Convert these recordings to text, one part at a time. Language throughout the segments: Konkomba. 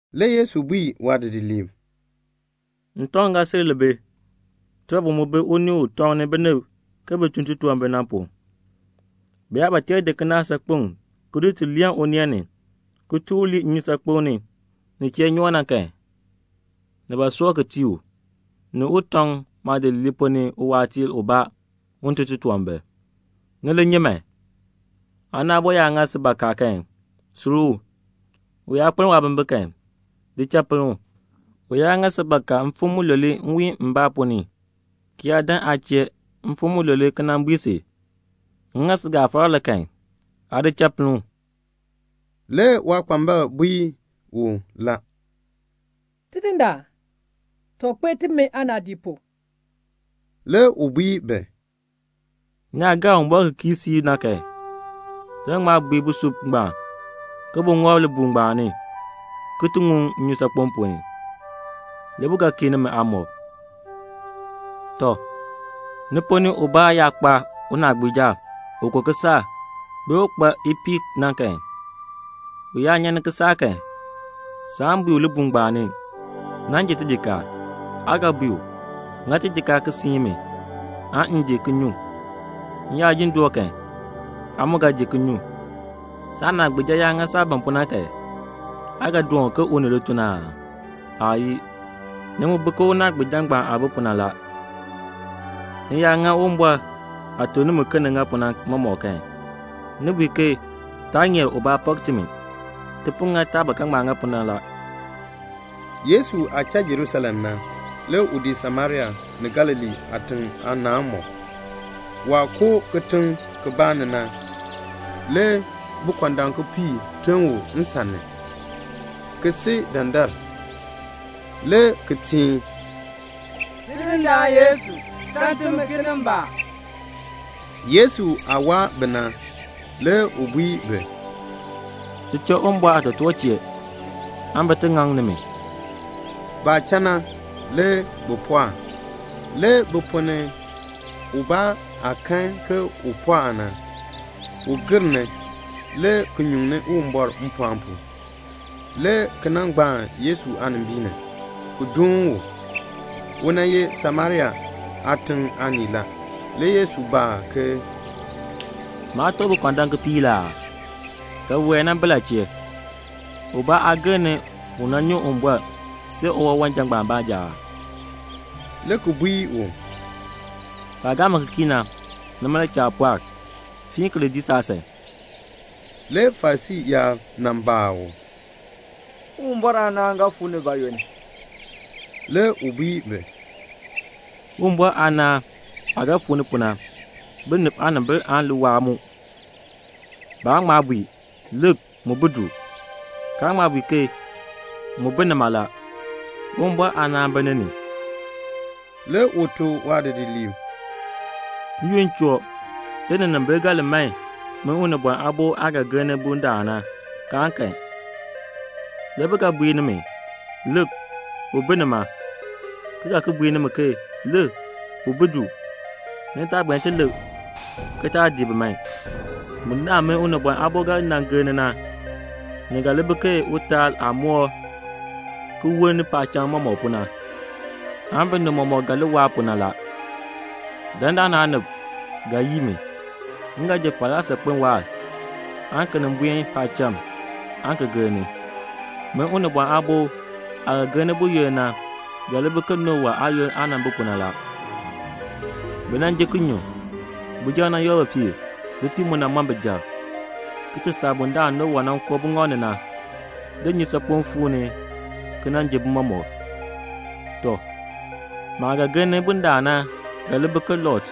Le Yesu bui waadidiliib, "Ntɔŋ ga sil li bi; tibɔbil mu bi unii u tɔŋni binib ke bi tun titunwambir na. Bi yaa ba tee di kinaak saakpeŋ ki di tul leen uneen ni, ki tur u lii nnyusaakpem nin chee nyoo na ni kan, ni soor ki tii u, ni u tɔŋ maadidiliib ponn ni uwaatiir ubaa un tun titunwambir. Ni li nyi man. "Aana aabo yaa ŋa si bakaa kan, sur u. U yaa kpeln waabimbin kan, di cha pinn u. U yaa ŋa si bakaa mfim mulule nwiin mbaa ponn ni, ki yaa dan aa chee mfim mulule ki bui si, 'M ŋa si gafara la,' aa di cha pinn u." Le waakpambalb bui u, "Tidindaan, too kpee timi aanaadii pu." Le u bui bi, "Ni yaa gaa Uwumbɔr ki kii siib kan, ni ga bui busub ngbaan ke bu ŋɔb libuul ngbaan ni ki ti ŋuŋ nnyusaakpem ponn ni, le bu ga kii nimi aamɔb." "Tɔ, ni ponn ni ubaa yaa kpa unaagbiija u ko kisaak, bee u kpaa ipiih na kan, u yaa nyan ni kisaak kan, saan bui u libuul ngbaan ni, 'Nan ji tijikaar.' Aa ga bui u, 'Ŋa tijikaar ki siin mi aan m ji ki nyu. M yaa jin doo kan, aa mu ga ji ki nyu.' Saanaagbiija yaa ŋa saah ban pu na kan, aa ga doon u ke u ni lituln aa? Aayii. Ni mu bi ke unaagbiija ngbaan aah bi pu na la. Ni yaa ŋa Uwumbɔr aah tuk nimi ke ni ŋa pu na mɔmɔk kan, ni bui ke 'Taa ŋeer ubaa pak timi. Ti po ŋa taah ba ga ŋa pu na la."' Yesu aah cha Jerusalem na, le u dii Samaria ni Galilee aatiŋ aanaanmɔk. Waah koo kitiŋ kibaa ni na, le bikɔndam kipiik ton u nsan ni, ki si dandar, le ki teen, "Tidindaan Yesu, sam timi kinimbaak." Yesu aah waa bi na, le u bui bi, "Li cha Uwumbɔr aatotoortiib chee, bin ti ŋaŋ nimi." Le baah cha na, bi pɔɔk a. Le bi ponn ni ubaa, waah kan ke u pɔɔk na, le u gir ni, le ki nyuŋni Uwumbɔr mpɔɔn pu, le ki nan gbaan Yesu aanimbiin ni, ki dooni u. U ye Samaria aatiŋ aanii la. Le Yesu baa ke, "Maa teb bikɔndam kipiik la aa? ke biwae na bi la chee? Ubaa aa gir ni un ti nyuŋ Uwumbɔr see uwawanja ngbaan baanja aa?" le ki bui u, "Saah gaa mi ki kii na, nima le cha aa pɔɔk. Fiin ki li dii saasan." Le Farisii yaab nan baa u, "Uwumbɔr aanaan ga fuu ni bayoonn?" Le u bui bi, "Uwumbɔr aanaan aah ga fuu ni pu na, binib aanimbil aan li waa mu. Baan ŋma bui, 'Lik, mu bi du,' kaan ŋma bui ke, 'Mu bi nima la.' Uwumbɔr aanaan bi ni ni." Le u tuk waadidiliib, "N-yoonn choo, le ninimbil ga li man min Unibɔn Aabo aah ga gir ni bundaln na, kaan kan. Le bi ga bui nimi, 'Lik, u bi nima,' ki ga ki bui ke 'Lik, u bi du.' Ni taa buen ti lik, ki taa dii bi man. Bundaln min Unibɔn Aabo ga nan gir ni na, ni ga li bi ke utaal aah moo ki woln paacham mɔmɔk pu, binib mɔmɔk ga li waa pu na. Dandana aanib ga yii mi. M ga ji falaa saakpen waahr, aan ki nin buen paacham aan ki gir ni. Min Unibɔn Aabo aah ga gir ni buyoonn na ga li bi ke Nowa aayoonn aah nan bi pu na. Bi nan ji ki nyu, bijab nan yoor bipiib, bipiib mu nan mɔn bijab, ki ti saa bundaln Nowa nan koo buŋɔb ni na, le nnyusaakpem fuu ni ki jin bi mɔmɔk. Tɔ, maah ga gir ni bundaln na ga li bi ke Lot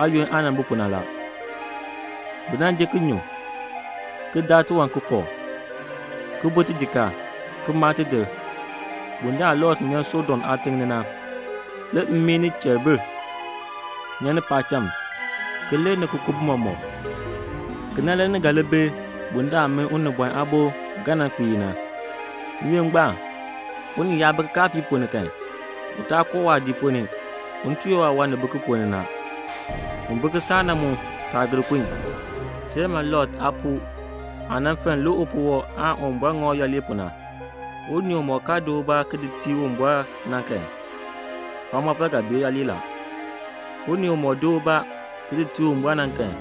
aayoonn aah nan bi pu na. Bi nan ji ki nyu, ki daa tiwan ki kooh, ki bu tijikaar, ki maa tidir. Bundaln Lot nyan Sodom aatiŋ ni na, le mmii ni cheribir nyan ni paacham ki lir ki ku bi mɔmɔk. Kena le ni ga li bi bundaln min Unibɔn Aabo ga nan kpiir na. "N-yoonn ngbaan, unii yaa bi kikaafiik ponn ni kan, u taa koo waadiik ponn ni un ti yoor waawan ni bi ki ponn ni na. Un bi kisaak na mu taa gir kun. Teer man Lot aapuu aah nan fenn lik upuwɔb na, le Uwumbɔr ŋa u yooli. Unii umɔk kaa di ubaa ki di tii Uwumbɔr na kan, waamɔfal ga bee yooli la. Unii umɔk di ubaa ki di tii Uwumbɔr na kan,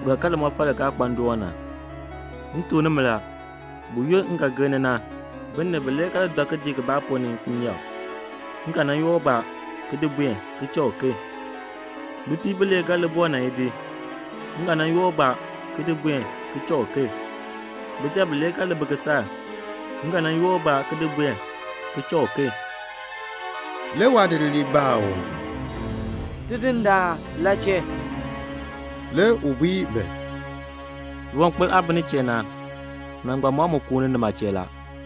u ga kan limɔfal li kaa kpa ndoon na. M tuk nimi la, buyoonn m ga gir ni na, binib bilee ga li dɔ kidiik kibaa ponn ni kinyeek. M ga nan yoor ubaa ki di buen, ki cha uken. Bipiib bilee ga li boo nan idi. M ga nan yoor ubaa ki di buen, ki cha uken. [Bijab bilee ga li bi kisaak. M ga nan yoor ubaa ki di buen, ki cha uken.]" Le waadidiliib baa u, "Tidindaan, la chee?" Le u bui bi, "Liwankpol aah bi nin chee na, nangbal mam mu kuuni nima chee la."